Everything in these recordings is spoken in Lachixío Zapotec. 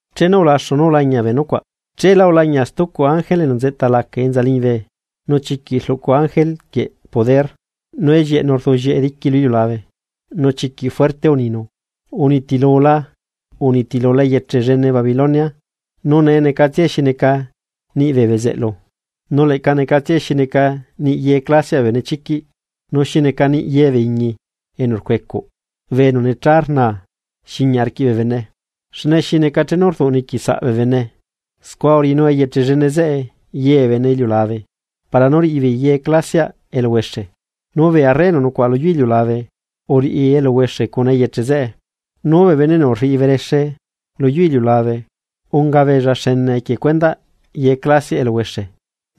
Chenu ulaxu nú ulañia bee nucuaꞌ, cheela ulañia stucu ángele enu nzeꞌta laca enza liñibe nu chiquiꞌ rluꞌcu ángele quieꞌ poder, nu ellieꞌnu uduꞌllieꞌe diqui lu iliulabe, nu chiquiꞌ fuerte uninu: ―Unitilula, unitilula eyeche llene Babilonia nu nee necatsiae xi neca niꞌ bee bezeꞌlu, nu leꞌca necatsiae xi neca niꞌ ye clasiaꞌ bee benechiquiꞌ, nu xi neca niꞌ ye bee iñi enu rcuecuꞌ bee enu necha rna xiñia arquiꞌ bee bene. Xne xi neca chenu rduꞌniqui saꞌ bee bene, scua uriꞌinu eyeche llene zeꞌe ye bee bene iliulabe para nú riꞌi beei ye clasiaꞌ eluhuexe, nu bee arre enu nucuaꞌa lu yu iliulabe uriꞌi eluhuexe cuna eyeche zeꞌe, nu bee bene enu rriꞌi berexe lu yu iliulabe unga beella xene equie cuendaꞌ ye clasiaꞌ eluhuexe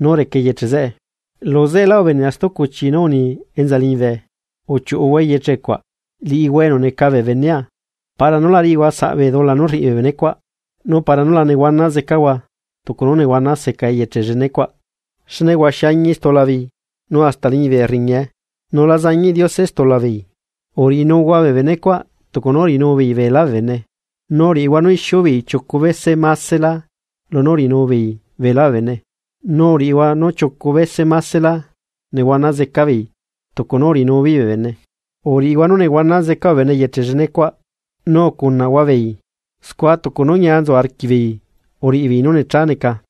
nú reca eyeche zeꞌe. Luzeꞌelá ubenea stucu chi nú uni enza liñibe: ―Uchiuꞌuhua eyeche cuaꞌ, liꞌihua enu neca bee benea para nú la riꞌihua saꞌ bee dula nú rriꞌi bee benecuaꞌ, nu para nú la nehuana zecahua tucu nú nehuana zeca eyeche llenecuaꞌ. Xne huaxi añi stula beei nu hasta liñibe riñae, nu la zañiꞌ Diose stulabeei. Uriꞌinuhua bee benecuaꞌ tucu nú uriꞌinubeei beelá bee bene, nu uriꞌihua nú ixiubeei chiucu bese másela lunú uriꞌinu beei beelá bee bene, nu uriꞌihua nú chiucu bese másela nehuana zeca beei tucu nú uriꞌinubeei bee bene. Uriꞌihua nú nehuana zeca bee bene eyeche llenecuaꞌ nu ucunaꞌhua beei, scua tucu nú ñia nzu arquiꞌbeei uriꞌi beei nú necha neca,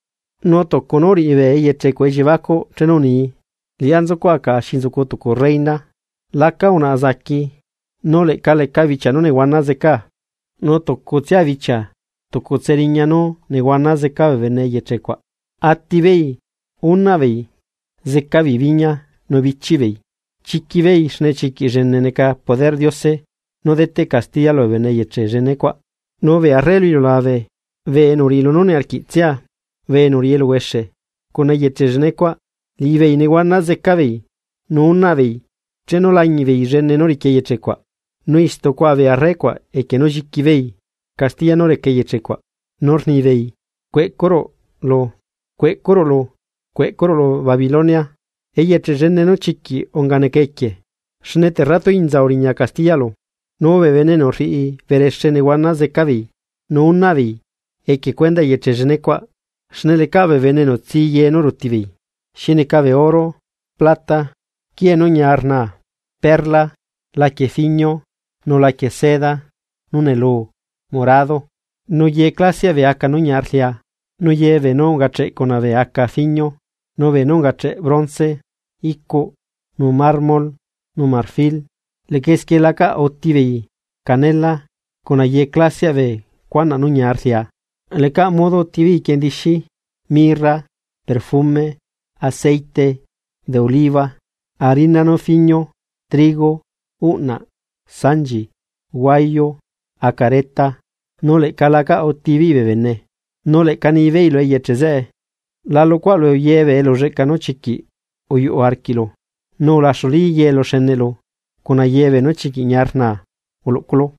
nu tucu nú uriꞌi bee eyeche cuaꞌ elliebacuꞌ chenu unii: “Liꞌá nzucuaꞌa caꞌa xi nzucu tucu reyna, laca unaꞌa zaqui, nu leꞌca lecaꞌ bichia nú nehuana zecaa.” Nu tucutsia bichia tucutse riña nú nehuana zeca bee bene eyeche cuaꞌ, atibeei, unaꞌbeei, zeca beei biñia, nu bichiꞌ beei, chiquibeei xne chiquiꞌ llene neca poderꞌ Diose nú deteꞌ castiya lubee bene eyeche llene cuaꞌ. Nu bee arre lu iliulabe bee enu uriꞌi lunú niarquiꞌtsia, bee enu uriꞌi eluhuexe, cuna eyeche llenecuaꞌ, liꞌibeei nehuana zeca beei, nu unaꞌbeei, chenu lañiꞌbeei llene nú riqui eyeche cuaꞌ. Nu istu cuaꞌa bee arre cuaꞌ equie nú xiquibeei castiya nú reca eyeche cuaꞌ, nu rnibeei: ―¡Cueꞌcurulu, cueꞌcurulu Babilonia, eyeche llene nú chiquiꞌ unga neca equie! Xne terratuinza uriña castiyaꞌlu. Nu bee bene enu rriꞌi berexe nehuana zeca beei nu unaꞌbeei equie cuendaꞌ eyeche llenecuaꞌ xne lecaꞌ bee bene enu tsi ye nú rutibeei: xi neca bee oro, plata, quiee nú ñia rnaa, perla, laquie fiñio, nu laquie seda nú neluu morado, nu ye clasiaꞌ bee aca nú ñia rlia nu ye beenú ungacheꞌ cuna bee aca fiñio, nu beenú ungache bronce, icuꞌ, nu mármol nu marfil. Leꞌca esquie lacaꞌ utibeei canela cuna ye clasiaꞌ bee cuanaꞌ nú ñia rlia, lecaꞌ modo utibeei quiendixi, mirra, perfume, aceite de oliva, harina nú fiñio, trigo, uꞌnaꞌ, sanchi, huayu, acareta, nu leꞌca la acaꞌ utibeei bee bene. Nu leꞌca nibeei lu eyeche zeꞌe: ―¡La luꞌcuaꞌlu ye bee elulleꞌca nú chiquiꞌ uyuꞌu arquiꞌlu, nu ulaxulí ye eluxeneꞌlu cuna ye beenú chiquiꞌ ñia rnaa uluꞌculu!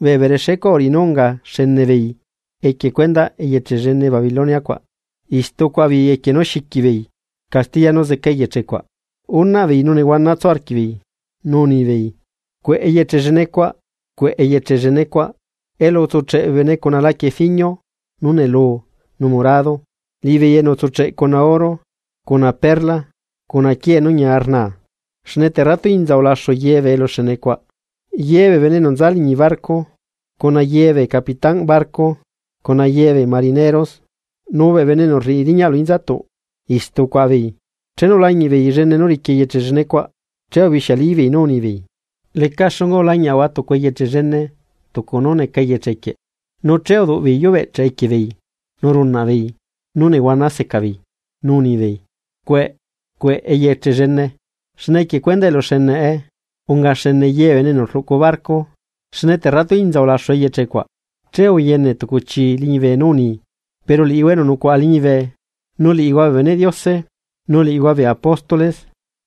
Bee berexecuaꞌ uriꞌi nú unga xene beei equie cuendaꞌ eyeche llene Babilonia cuaꞌ, istu cuaꞌa beei equie nú xiquibeei castiya nú zeca eyeche cuaꞌ, unaꞌbeei nu nehuana tsu arquiꞌbeei. Nu nibeei: ―¡Cueꞌ eyeche llene cuaꞌ, cueꞌ eyeche llene cuaꞌ! Elu utsucheꞌe bee bene cuna laquie fiñio, nú neluu nu morado, liꞌibeei enu utsucheꞌ cuna oro, cuna perla cuna quiee nú ñia rnaa. ¡Xne terratuinza ulaxu ye bee eluxenecuaꞌ! Ye bee bene enu nza liñi barco, cuna ye bee capitánꞌ barco, cuna yebee marinero nu bee bene enu rriꞌi riñaꞌ lu inzatuꞌ, istu ucuaꞌa beei. Chenu ulañiꞌbeei llene nú riqui eyeche llene cuaꞌ, che ubixiali beei nú unibeei: ―¿Leca xunga ulañiaꞌahua tucu eyeche llene tucu nú neca eyeche quieꞌ? Nu che uduꞌbeei yubeꞌchaꞌ equie beei nu runaꞌbeei, nú nehuana seca beei, nu unibeei: ―¡Cueꞌe! ¡Cueꞌ eyeche llene! Xne equie cuendaꞌ eluxeneꞌe unga xene ye bee bene enu rluꞌcu barco, ¡nu terratuinza ulaxu eyeche cuaꞌ! Che uyene tucu chii liñibe nú uni: ―Pero liꞌihua enu nucuaꞌa liñibe, nu liꞌihua bee beneꞌ Diose, nu liꞌihua bee apóstol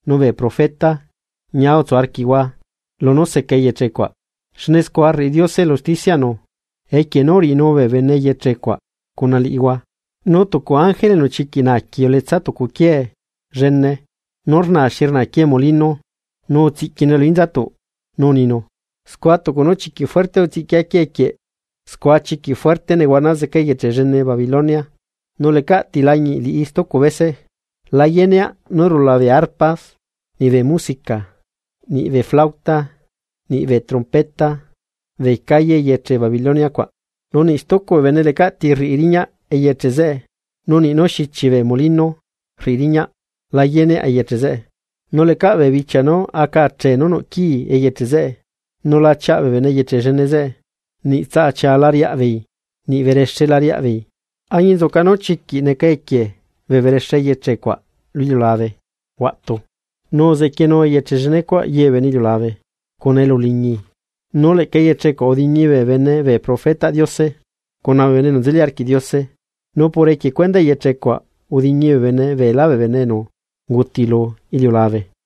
nu bee profeta, ñia utsu arquiꞌhua lunú seca eyeche cuaꞌ xne scua rriꞌi Diose elu usticiaꞌnu equie nú uriꞌinu bee bene eyeche cuaꞌ cuna liꞌihua. Nu tucu ángele enu chiquiꞌ naaqui uletsa tucu quiee llene, nú rnaa xi rnaa quiee molino nu utsiꞌquinue lu inzatuꞌ, nu uninu: ―Scua tucu nú chiquiꞌ fuerte utsiꞌquia quiee quieꞌ, scua chiquiꞌ fuerte nehuana zeca eyeche llene Babilonia, nu lecaꞌti lañiꞌ liꞌi stucu bese. La yeneaꞌ nú rula bee arpas, niꞌ bee musica, niꞌ flauta, niꞌ bee trompeta bee calle eyeche Babilonia cuaꞌ. Nu niꞌ stucu bee bene lecaꞌ ti rriꞌi riñaꞌ eyeche zeꞌe, nu niꞌ nú xichi bee molino rriꞌi riñaꞌ la yeneaꞌ eyeche zeꞌe. Nu lecaꞌ bee bichia nú aca achee nú nuꞌ quii eyeche zeꞌe, nu la chiaꞌ bee bene eyeche llene zeꞌe, niꞌ tsaꞌa chia la riaꞌa beei, niꞌ berexe la riaꞌbeei, añinzuca nú chiquiꞌ neca equie bee berexe eyeche cuaꞌ lu iliulabe huaꞌtu, nu uzequienu eyeche llene cuaꞌ ye bee bene iliulabe cuna elu uliñi. Nu leꞌca eyeche cuaꞌ udiñi bee bene bee profetaꞌ Diose, cuna bee bene enu nzeli arquiꞌ Diose, no por equie cuendaꞌ eyeche cuaꞌ udiñi bee bene beelá bee bene enu unguti lu iliulabe.